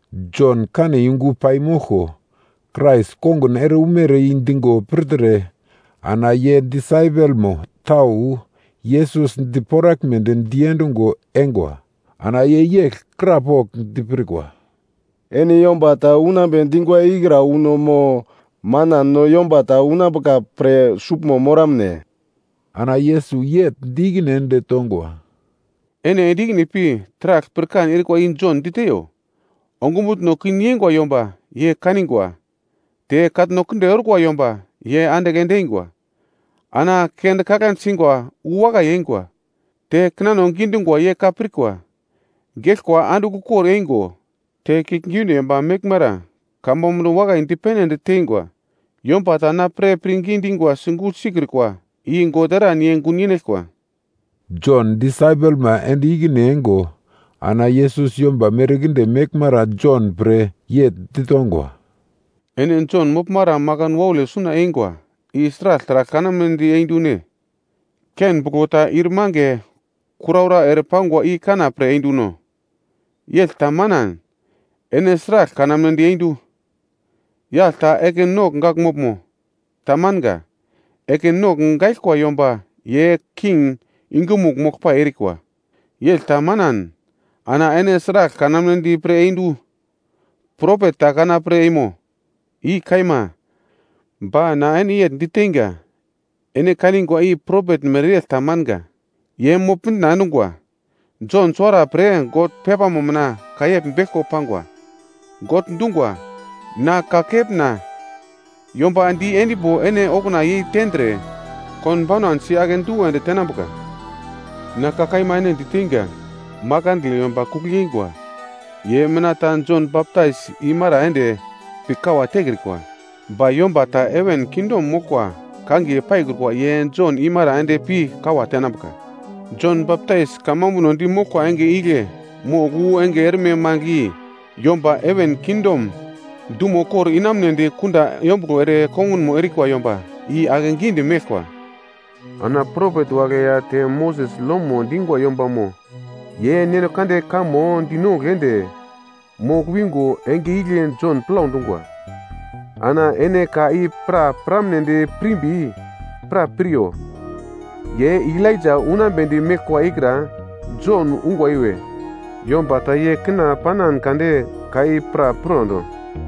Jon kane yungu paimoglko Krais kongun ere umere i digo pirtre ana ye disaipelmo tau Yesus diporaglmedi diendungo eingwa. Ana ye yegl krapogl dipirkwa, “Ene yomba ta unambe dingura ikra uno mo, manan no yomba ta unambuka pre suglmo moramne?” Ana Yesus yegl di ikine ende tongwa, “Ene ende ikine pi taragl pirkan erikwa i Jon diteiyo. Ongumutno kin yeingwa yomba ye kanigwa te katno kinde orkwa yomba ye andigl ende eingwa. Ana kende kaglande singwa wu wakai eingwa, te kinano gidungwa ye ka pirkwa. Geglkwa andigl ukor eingo te kiuglgiunde yomba meglmara kamambuno wakai dipene ende teingwa. Yomba ta na pre pirngi dingwa gugl sikrukwa i God eran ye gun yenaglkwa.” Jon disaipelma ende ikine eingo ana Yesus yomba merkinde meglmara Jon pre yegl ditongwa, “Ene Jon moglmara makan waule suna eingwa i sragl taragl kanamnedi eindune? Ken buglo ta ir mange kuraura ere pangwa i kana pre einduno? Yegl ta manan, ene sragl kanamnedi eindu? Yagl ta ekin nogl gagl moglmo? Tamanga, ekin nogl gaiglkwa yomba ye king yungumugl moglpai erikwa. Yegl ta manan ana ene sragl kanamnedi pre endu? Propet ta kana pre eimo? I kaima, ba na ene yegl diteinga, ene kanigwa i propet mereyegl ta manga. Ye mogl-mitna endungwa. Jon suwara pre God pepamo mina ka yegl beglko pangwa. God dungwa, “‘Na kakepna yomba di endimbo ene okuna yei tendre, konbaunan si akedu ende tenambuka.’ Na ka kaima ene diteinga, makandle yomba kugl yeingwa ye mina ta Jon Baptais imara ende pi kawa tekrikwa. Ba yomba ta heven kingdom moglkwa kangiye paikrukwa ye Jon imara ende pi kawa tenambuka. Jon Baptais kamambuno di moglkwa enge igle mogl wu enge erme mangigl i, yomba heven kingdom dumo kor inamunedi kunda yombuglo ere kongunmo erikwa yomba, i akegidi meglkwa. Ana propet wagle ya te Moses lomo dingwa yombamo ye Neno Kande kamo dinongugl ende, mogl wingo enge igle Jon plau dungwa. Ana ene ka i pra piramnedi pirmbi, pra piryo. Ye Elaija unambedi meglkwa ikra Jon ungwa iwe. Yomba ta ye kina panan kade ka i pra pirondo.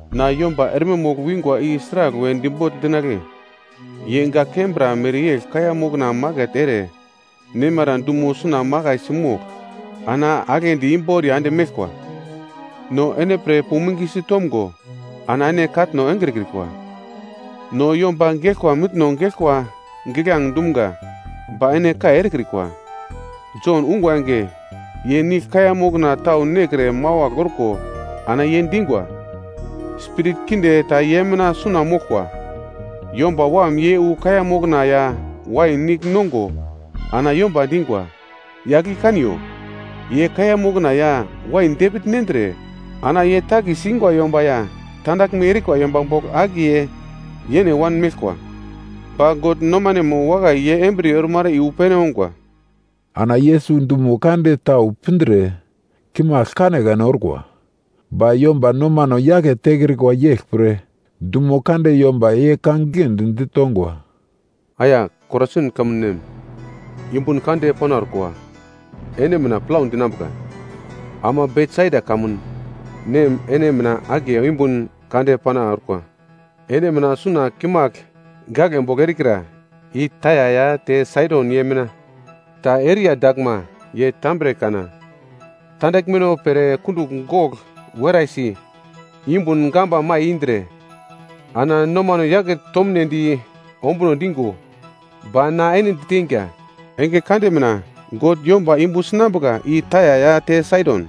“Na yomba erme mogl wingwa i sraglwe dibogl dinagle? Ye gak kembra mereyegl kaiya mokna maket ere nemara dumo suna makaisi mogl ana aglendi imboriya ende meglkwa: “‘No ene pre puming sitomgo, ana ene katno engrekrikwa, no yomba geglkwa mitno geglkwa giglange dumga, ba ene kai erekrikwa.’ Jon ungwa enge, ye nigl kaiya mokna tau nekre mawagl orko ana ye dingwa, ‘Spirit kinde ta ye mina suna moglkwa.’ Yomba Wam ye wu kaiya mokna ya wain nigl nongo ana yomba dingwa, ‘Yagl i kaniyo! Ye kaiya mokna ya wain depigl nendre ana ye takis ingwa yomba ya tandaglme erikwa yomba bogl akiye yene wanmeglkwa.’ Ba God nomanemo wakai ye embriye ormara i wu pene ongwa.” Ana Yesus dumo kande tau pindre kimagl kanekane orkwa, ba yomba nomano yake tekrikwa yeglpre, dumo kande yomba ye ka giglendi ditongwa. “Aya Korasin kamun nem, yumbun kande pana orkwa ene mina plau dinambuka! Ama Betsaida kamun nem ene mina akiye yumbun kande pana orkwa! Ene mina suna kimagl gaglebogl erikra i Taia ya te Saidon ye mina ta eriya daglma, ye tambre kana tandaglmeno pre kundugl gogl weraisi, yungum gamba mai indre, ana nomano yake tomnedi ombuno digo. Ba na ene diteinga, enge kande mina God yomba yumbu sinambuka i Taia ya te Saidon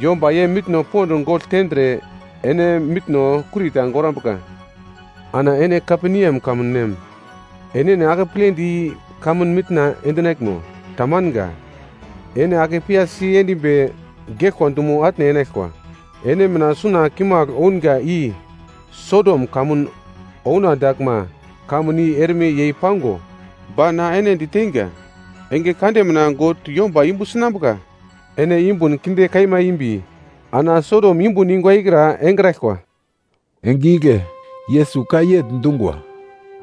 yomba ye mitno pond gogl tendre, ene mitno kurita gorambuka. Ana ene Kaperneam kamun nem, enene akepledi i-kamun mitna endinaglmo? Tamanga. Ene ake piyasi endimbi geglkwa dumo atne enaglkwa. Ene mina suna kimagl ounga i Sodom kamun ouna daglma, kamun i erme yei pango. Ba na ene diteinga, enge kande mina God yomba yumbu sinambuka. Ene yumbun kinde kaima imbi ana Sodom yumbun ingwa ikra engraglkwa.” Enge igle Yesus ka yegl dungwa,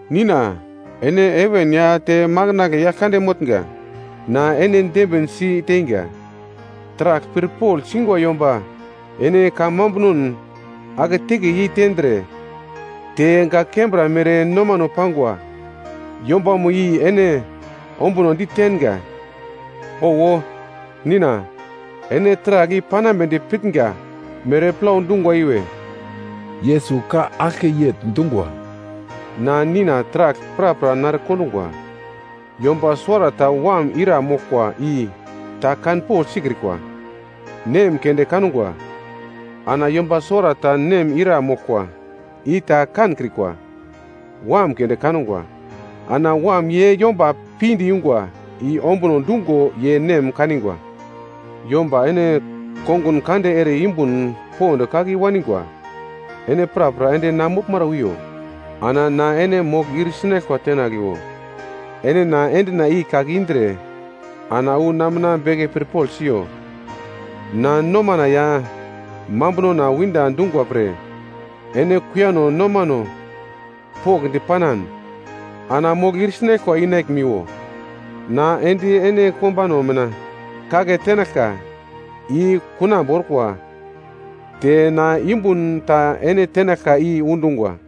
“Nina, ene heven ya te makandle Yaglkande motnga, na ene dembin si teinga. Taragl pirpogl singwa yomba ene kamambunon aketeke yeitendre, te gak kembra mere nomano pangwa yombamo i ene ombunodi tenga. Owo, Nina, ene taragl i panambedi pitnga mere plau dungwa iwe.” Yesus ka aglke yegl dungwa, “Na Nina taragl prapra nare kondungwa, yomba suwarata wam ira moglkwa i ta kanpogl sikrikwa. Nem keunde kangwa, ana yomba suwarata nem ira moglkwa i ta kankrikwa. Wam keunde kangwa, ana Wam ye yomba pinde yungwa i ombuno dungo ye nem kanigwa. “Yomba ene kongun kande ere yumbun pond kake i-wanigwa, ene prapra ende na moglmara wiyo, ana na ene mogl ir sinaglkwa tenagliwo. Ene na endina i kake indre ana wu na mina beke pirpogl siyo, na nomana ya mambunona winda dungwa pre, ene kuiyano nomano pokndi panan, ana mogl ir sinaglkwa inaglimiwo. Na endi ene kombano mina kake tenaglka i kunambu orkwa, te na yumbun ta ene tenaglka i undungwa.”